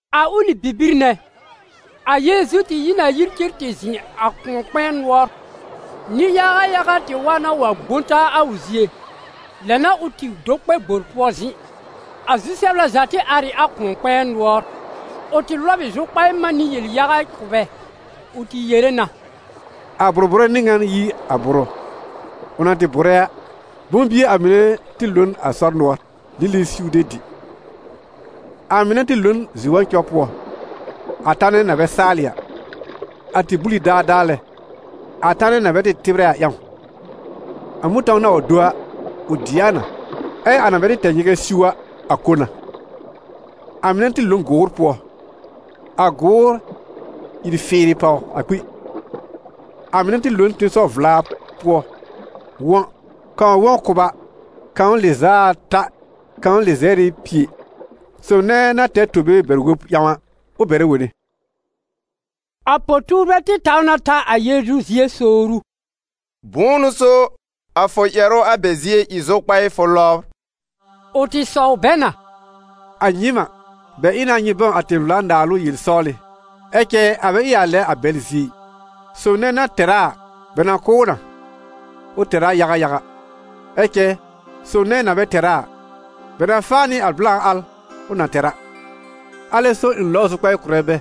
A ʋlɩ bibir nɛ, a Yeezu tɩ yi n a yir cen tɩ zɩ̃ a kʋ̃ɔ-kpɛ̃ɛ nʋɔr. Nɩ-yaga yaga tɩ wa na wa gbõ taa a ʋ zie, lɛ n'a ʋ tɩ do kpɛ gbor pʋɔ zɩ̃. A zu-sɛbla za tɩ ar ɩ a kʋ̃ɔ-kpɛ̃ɛ nʋɔr. Ʋ tɩ lɔb ɩ zʋkpaɩ man nɩ yel-yaga kʋ̀ bɛ, ʋ tɩ yere na: «A bʋ̀r-bʋ̀rɛ n'ɩ ŋan yi a bʋrʋ. Ʋ na tɩ bʋ̀rɛ a, bʋ̃-bie a mɩnɛ tɩ lo n a sɔr nʋɔr, lili siw de dɩ. A mɩnɛ tɩ lo n zi-wɔ̃cɔ pʋɔ, a tanɛ na bɛ saalɩ a. A tɩ bul ɩ daadaa lɛ, a tanɛ na bɛ tɩ tɩbrɛ a ƴãw. A mʋ̃tɔ̃w na wa do a, ʋ dɩ a na, ɛ a na bɛ tɩ tɛ nyɩgɛ siw a, a ko na. A mɩnɛ tɩ lo n gʋʋr pʋɔ, a gʋʋr ìr fɩɩrɩ pàw a kpi. A mɩnɛ tɩ lo n tẽsɔw-vla pʋɔ wɔ̃: kãw wɔ̃ kʋba, kãw lɩz'a ata, kãw lɩzɛr nɩ pie. Sob nɛ na tɛr tobe bɛr-wob ƴãw a, ʋ bɛrɛ wone.» A po-tuurbɛ tɩ taw na ta a Yeezu zie sowr ʋ: «Bʋ̃ʋ n'ʋ so a fʋ ƴɛrʋ a bɛ zie ɩ zʋkpaɩ fʋ lɔbr?» Ʋ tɩ sɔw bɛ na: «A nyɩɩm a, bɛ ɩ na nyɩ bãw a tẽ-vla-naalʋ yel-sɔwlɩ, ɛ cɛ a bɛ ɩ a lɛ a bɛl zie ɩ. Sob nɛ na tɛr a a, bɛ na kʋ̀ ʋ na, ʋ tɛr a yaga yaga; ɛ cɛ sob nɛ na bɛ tɛr a a, bɛ na faa nɩ a blã al ʋ na tɛr a. Alɛ so ɩ̃ lɔbr zʋkpaɩ kʋ̀rɛ bɛ: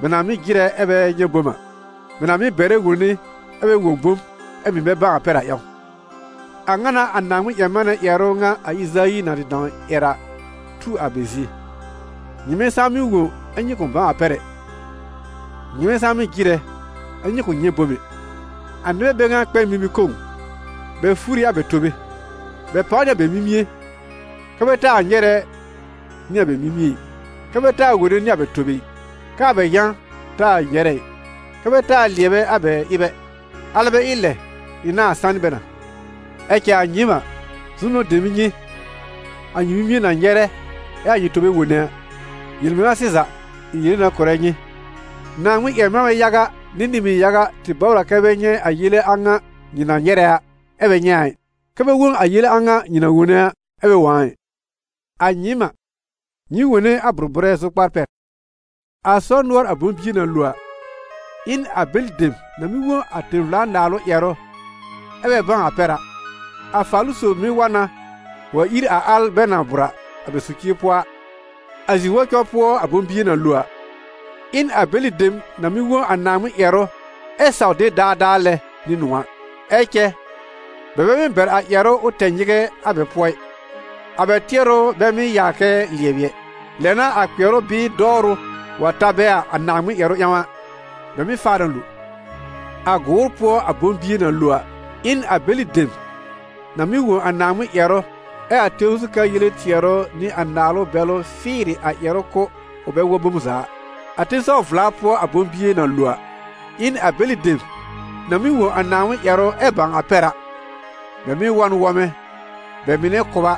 bɛ na mɩ́ jɩrɛ ɛ bɛ nyɛ̃ bom a, bɛ na mɩ́ bɛrɛ wone ɛ bɛ wõ bom, ɛ mɩ̀ bɛ bãw a pɛr a ƴãw. A ŋa n'a a Naaŋmɩn-ƴɛr-manɛ ƴɛrʋ ŋa a Ɩzayi na tɩ dãw ƴɛr a tu a bɛ zie: ‹Nyɩmɛ saa mɩ́ wõ ɛ nyɩ kʋ̃ bãw a pɛr ɛ, nyɩmɛ saa mɩ́ jɩrɛ, ɛ nyɩ kʋ̃ nyɛ̃ bom ɛ. A nɩbɛ bɛ ŋa kpɛ n mimi-kõw, bɛ fur ɩ a bɛ tobe, bɛ pàw nɩ a bɛ mimie, kɛ bɛ taa nyɛrɛ nɩ a bɛ mimie ɩ, kɛ bɛ taa wone nɩ a bɛ tobe ɩ, kɛ a bɛ yã taa nyɛrɛ ɩ, kɛ bɛ taa lɩɛbɛ a bɛ ɩb ɛ alɛ bɛ ɩ lɛ, ɩ̃ nãá sanɩ bɛ na.› Ɛ cɛ a nyɩɩm a, zu-nʋ̃ɔ̀ dem ɩ nyɩ, a nyɩ mimie na nyɛrɛ, ɛ a nyɩ tobe wone a. Yel-mɩŋa sɩza, ɩ̃ yere na kʋ̀rɛ nyɩ, Naaŋmɩn-ƴɛr-manbɛ yaga nɩ nɩ-mɩn yaga tɩ bɔbr a kɛ bɛ nyɛ̃ a yele a ŋa nyɩ na nyɛrɛ a, ɛ bɛ nyɛ̃ a ɩ, kɛ bɛ wõ a yele a ŋa nyɩ na wone a, ɛ bɛ wõ a ɩ.» «A nyɩɩm a, nyɩ wone a bʋ̀r-bʋ̀rɛ zʋkpar pɛr. A sɔr nʋɔr a bʋ̃-bie na lo a, ɩ n a bɛlɩ dem na mɩ́ wõ a tẽ-vla-naalʋ ƴɛrʋ ɛ bɛ bãw a pɛr a. A Faalʋ-sob mɩ́ wa na wa ír a al bɛ na bʋ̀r a bɛ socir pʋɔ a. A zi-wɔ̃cɔ pʋɔ a bʋ̃-bie na lo a, ɩ n a bɛlɩ dem na mɩ́ wõ a Naaŋmɩn ƴɛrʋ ɛ saw de daadaa lɛ nɩ nʋ̃ɔ̀ a. Ɛ cɛ bɛ bɛ mɩ́ bɛr a ƴɛrʋ ʋ tɛ nyɩgɛ a bɛ pʋɔ ɩ, a bɛ tɩɛrʋ bɛ mɩ́ yaa kɛ lɩɛbɩ ɛ. Lɛ n'a a kpɩɛrʋ bɩɩ dɔwrʋ wa ta bɛ a Naaŋmɩn ƴɛrʋ ƴãw a, bɛ mɩ́ faa na lo. A gʋʋr pʋɔ a bʋ̃-bie na lo a, ɩ n a bɛlɩ dem na mɩ́ wõ a Naaŋmɩn ƴɛrʋ, ɛ a tẽw zu ka yele tɩɛrʋ nɩ a naalʋ bɛlʋ fɩɩrɩ a ƴɛrʋ kʋ́, ʋ bɛ wɔ̃ bom za a. A tẽsɔw-vla pʋɔ a bʋ̃-bie na lo a, ɩ n a bɛlɩ dem na mɩ́ wõ a Naaŋmɩn ƴɛrʋ ɛ bãw a pɛr a. Bɛ mɩ́ wɔ̃ n wɔmɛ: bɛ mɩnɛ kʋba,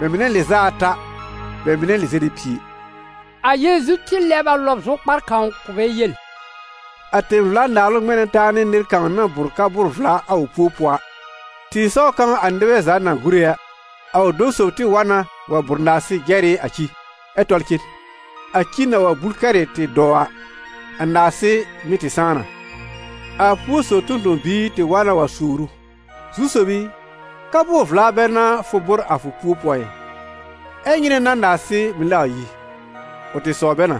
bɛ mɩnɛ lɩz'a ata, bɛ mɩnɛ lɩzɛr nɩ pie.» A Yeezu tɩ lɛb a lɔb zʋkpar kãw kʋ̀ bɛ yel: «A tẽ-vla-Naalʋ ŋmɛ̃ na taa nɩ nɩr kãw na bʋ̀r ka-bʋʋr-vla a ʋ púo pʋɔ a. Tɩ̃ɩsɔw kãw a nɩbɛ za na tɩ gúre a, a ʋ dɔ̃ sob tɩ wa na wa bʋ̀r narsɩ jɛr ɩ a ci, ɛ tɔl cen. A ci na wa bul kɛrɩ tɩ dɔw a, a narsɩ mɩ̀ tɩ sãá na. A púo sob tõ-tõ-biir tɩ wa na wa sowr ʋ: «Zu-sob i, ka-bʋʋr-vla bɛ n'a fʋ bʋ̀r a fʋ pu-pʋɔ ɩ, ɛ nyɩnɛ n'a narsɩ mɩ̀ lɛ wa yi?» Ʋ tɩ sɔw bɛ na: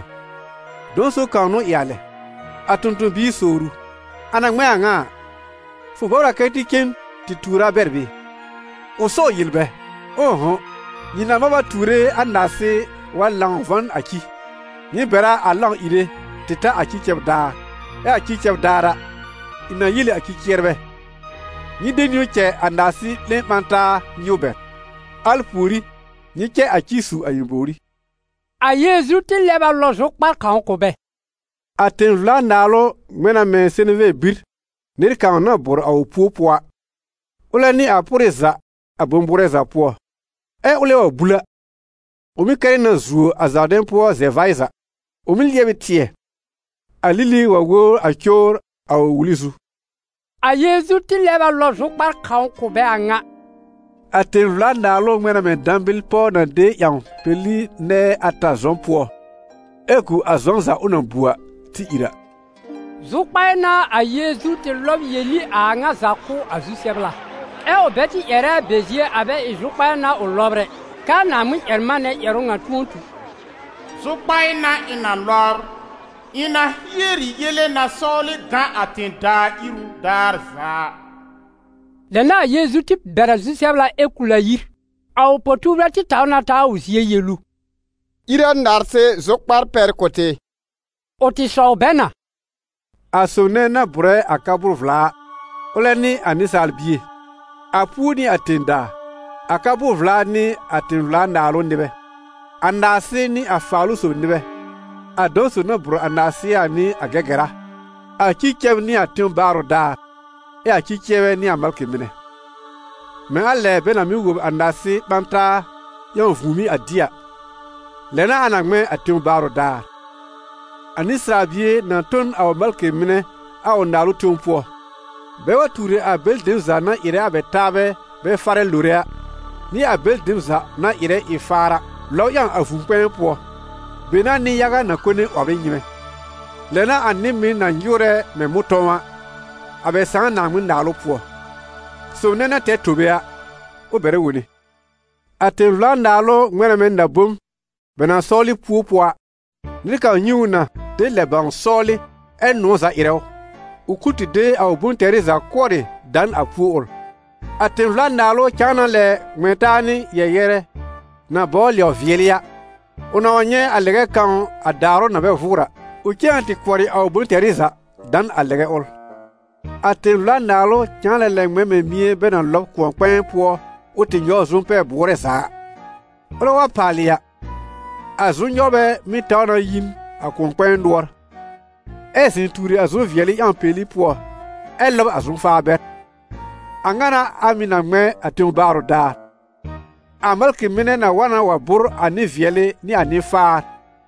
‹Dɔ̃ sob kãw n'ʋ ɩ a lɛ.› A tõ-tõ-biir sowr ʋ: ‹A na ŋmɛ̃ a ŋa a, fʋ bɔbr a kɛ tɩ cen tɩ tuur a bɛr bɩɩ?› Ʋ sɔw yel bɛ: ‹Ʋ̃ʋ'hʋ̃, nyɩ nãà mab a tuure a narsɩ wa lãw vɔ̃ n a ci›. Nyɩ bɛr a a lãw ìre tɩ ta a ci cɛb daar, ɛ a ci cɛb daar a, ɩ̃ na yel ɩ a cɩ-cɩɛrbɛ: ‹Nyɩ de niwn cɛ a narsɩ 'lẽ ɓã taa nyɩw bɛr, al pùorí nyɩ cɛ a ci su a ɩ̃ bòwrí.›» A Yeezu tɩ lɛb a lɔb zʋkpar kãw kʋ̀ bɛ: «A tẽ-vla-Naalʋ ŋmɛ̃ na mɛ̃ seneve bir nɩr kãw na bʋ̀r a ʋ púo pʋɔ a. Ʋlɛ n'ɩ a pʋrɩ za a bʋ̃-bʋʋrɛ za pʋɔ. Ɛ ʋlɛ wa bul a, ʋ mɩ́ kɛrɩ na zuo a zaardɛ̃ pʋɔ zɛ-vaɩ za; ʋ mɩ́ lɩɛb ɩ tɩɛ, a lili wa wobr a cowr a ʋ wuli zu.» A Yeezu tɩ lɛb a lɔb zʋkpar kãw kʋ̀ bɛ a ŋa: «A tẽ-vla-Naalʋ ŋmɛ̃ na mɛ̃ dãbɩl pɔw na de ƴãw peli nɛɛ ata zɔ̃ pʋɔ, ɛ gu a zɔ̃ za ʋ na bu a tɩ ìr a.» Zʋkpaɩ n'a a Yeezu tɩ lɔb yel ɩ a a ŋa za kʋ̀ a zu-sɛbla, ɛ ʋ bɛ tɩ ƴɛrɛ a bɛ zie a bɛ ɩ zʋkpaɩ n'a ʋ lɔbr ɛ, k'aa Naaŋmɩn-ƴɛr-manɛ ƴɛrʋ ŋa tʋ̃ɔ tu: «Zʋkpaɩ n'a ɩ̃ na lɔbr; ɩ̃ na hier ɩ yele na sɔwlɩ gã a tẽ-daa iru daar za a.» Lɛ n'a a Yeezu tɩ bɛr a zu-sɛbla ɛ kul a yir. A ʋ po-tuurbɛ tɩ taw na ta a ʋ zie yel ʋ: «Ír a narsɩ zʋkpar pɛr kʋ̀ tɩ.» Ʋ tɩ sɔw bɛ na: «A sob nɛ na bʋ̀rɛ a ka-bʋʋr-vla a, ʋlɛ n'ɩ a Nɩsaal Bie; a púo n'ɩ a tẽ-daa; a ka-bʋʋr-vla n'ɩ a tẽ-vla-Naalʋ nɩbɛ; a narsɩ n'ɩ a Faalʋ-sob nɩbɛ; a dɔ̃ sob na bʋ̀r a narsɩ a n'ɩ a Gɛgɛra; a ci cɛb n'ɩ a tẽw baarʋ daar; ɛ a ci-cɩɛrbɛ n'ɩ a malkɩ mɩnɛ. Mɛ̃ a lɛ bɛ na mɩ́ wob a narsɩ ɓã taa ƴãw vũùmí a dɩ a, lɛ n'a a na ŋmɛ̃ a tẽw baarʋ daar: a Nɩsaal Bie na tõ n a ʋ malkɩ mɩnɛ a ʋ Naalʋ tẽw pʋɔ, bɛ wa tuur ɩ a bɛlɩ dem za na ɩrɛ a bɛ taabɛ bɛ farɛ lore a, nɩ a bɛlɩ dem za na ɩrɛ ɩ-faar a, lɔb ƴãw a vũu-kpɛ̃ɛ pʋɔ, be n'a nɩ-yaga na kone 'wɔbr ɩ nyɩ́mɛ́. Lɛ n'a a nɩ-mɩn na nyɩwrɛ mɛ̃ mʋ̃tɔ̃w a, a bɛ Sãà Naaŋmɩn-Naalʋ pʋɔ. Sob nɛ na tɛr tobe a, ʋ bɛrɛ wone.» «A tẽ-vla-Naalʋ ŋmɛ̃ na mɛ̃ na-bom bɛ na sɔwlɩ púo pʋɔ a. Nɩr kãw nyɛ̃ ʋ na de lɛb bãw sɔwlɩ, ɛ nʋ̃ɔ̀ za ɩrɛ ʋ, ʋ kul tɩ de a ʋ bʋ̃-tɛrɩ za kʋɔrɩ da n a púo ʋl. A tẽ-vla-Naalʋ cãa na lɛ ŋmɛ̃ taa nɩ yɛ-yɛrɛ na bɔbr lɛw-vɩɛlɩ a. Ʋ na wa nyɛ̃ a lɛgɛ kãw a daarʋ na bɛ vʋʋr a, ʋ cen na tɩ kʋɔrɩ a ʋ bʋ̃-tɛrɩ za da n a lɛgɛ ʋl.» «A tẽ-vla-Naalʋ cãa na lɛ ŋmɛ̃ mɛ̃ mɩ̃ɛ bɛ na lɔb kʋ̃ɔ-kpɛ̃ɛ pʋɔ ʋ tɩ nyɔw zʋm-pɛ-bʋʋrɛ za a. Ʋlɛ wa paalɩ a, a zʋm-nyɔwrbɛ mɩ́ taw na yi n a kʋ̃ɔ-kpɛ̃ɛ nʋɔr, ɛ zɩ̃ tuuri a zʋm-vɩɛlɩ ƴãw peli pʋɔ, ɛ lɔb a zʋm-faar bɛr. A ŋa n'a a mɩ̀ na ŋmɛ̃ a tẽw baarʋ daar: a malkɩ mɩnɛ na wa na wa bʋ̀r a nɩ-vɩɛlɩ nɩ a nɩ-faar,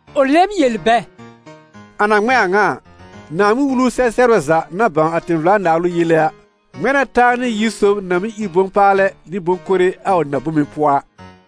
Ʋ lɛb yel bɛ: «A na ŋmɛ̃ a ŋa a, Naaŋmɩn-Wulu sɛ-sɛbrɛ za na bãw a tẽ-vla-Naalʋ yele a, ŋmɛ̃ na taa nɩ yir sob na mɩ́ ír bʋ̃-paalɛ nɩ bʋ̃-kore a ʋ na-bome pʋɔ a.»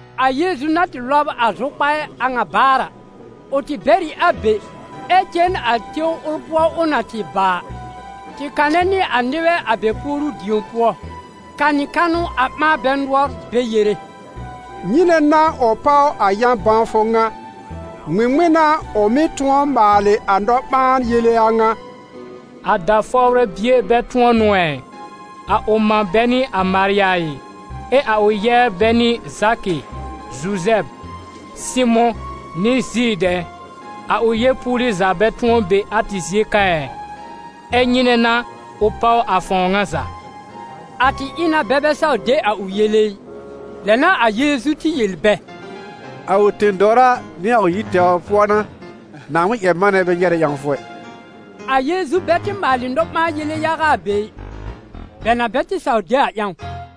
A Yeezu na tɩ lɔb a zʋkpaɩ a ŋa baar a, ʋ tɩ bɛr ɩ a be, ɛ cen a tẽw ʋl pʋɔ ʋ na tɩ bàa a, tɩ kanɛ nɩ a nɩbɛ a bɛ puoru-dĩo pʋɔ, kanɩ kanʋ a ɓãa bɛ nʋɔr, bɛ yere: «Nyɩnɛ n'a ʋ páw a yã-bãwfʋ ŋa? Ŋmɩŋmɩn n'a ʋ mɩ́ tʋ̃ɔ maalɩ a nɔ-ɓãa-yele a ŋa? A da-fɔwrɛ bie bɛ tʋ̃ɔ n'ʋ ɛ? A ʋ mã bɛ n'ɩ a Marya ɩ? Ɛ a ʋ yɛbr bɛ n'ɩ Zakɩ, Zuzɛb, Sɩmʋ̃ nɩ Zid ɛ? A ʋ yeepuuli za bɛ tʋ̃ɔ be a tɩ zie ka ɩ? Ɛ nyɩnɛ n'a ʋ páw a fãw ŋa za?» A tɩ ɩ na bɛ bɛ saw de a ʋ yele ɩ. Lɛ n'a a Yeezu tɩ yel bɛ: «A ʋ tẽ-dɔwra nɩ a ʋ yir tɛwr pʋɔ n'a Naaŋmɩn-ƴɛr-manɛ bɛ nyɛrɛ ƴãwfʋ ɛ.» A Yeezu bɛ tɩ maalɩ nɔ-ɓãa-yele yaga a be ɩ, bɛ na bɛ tɩ saw de a ƴãw.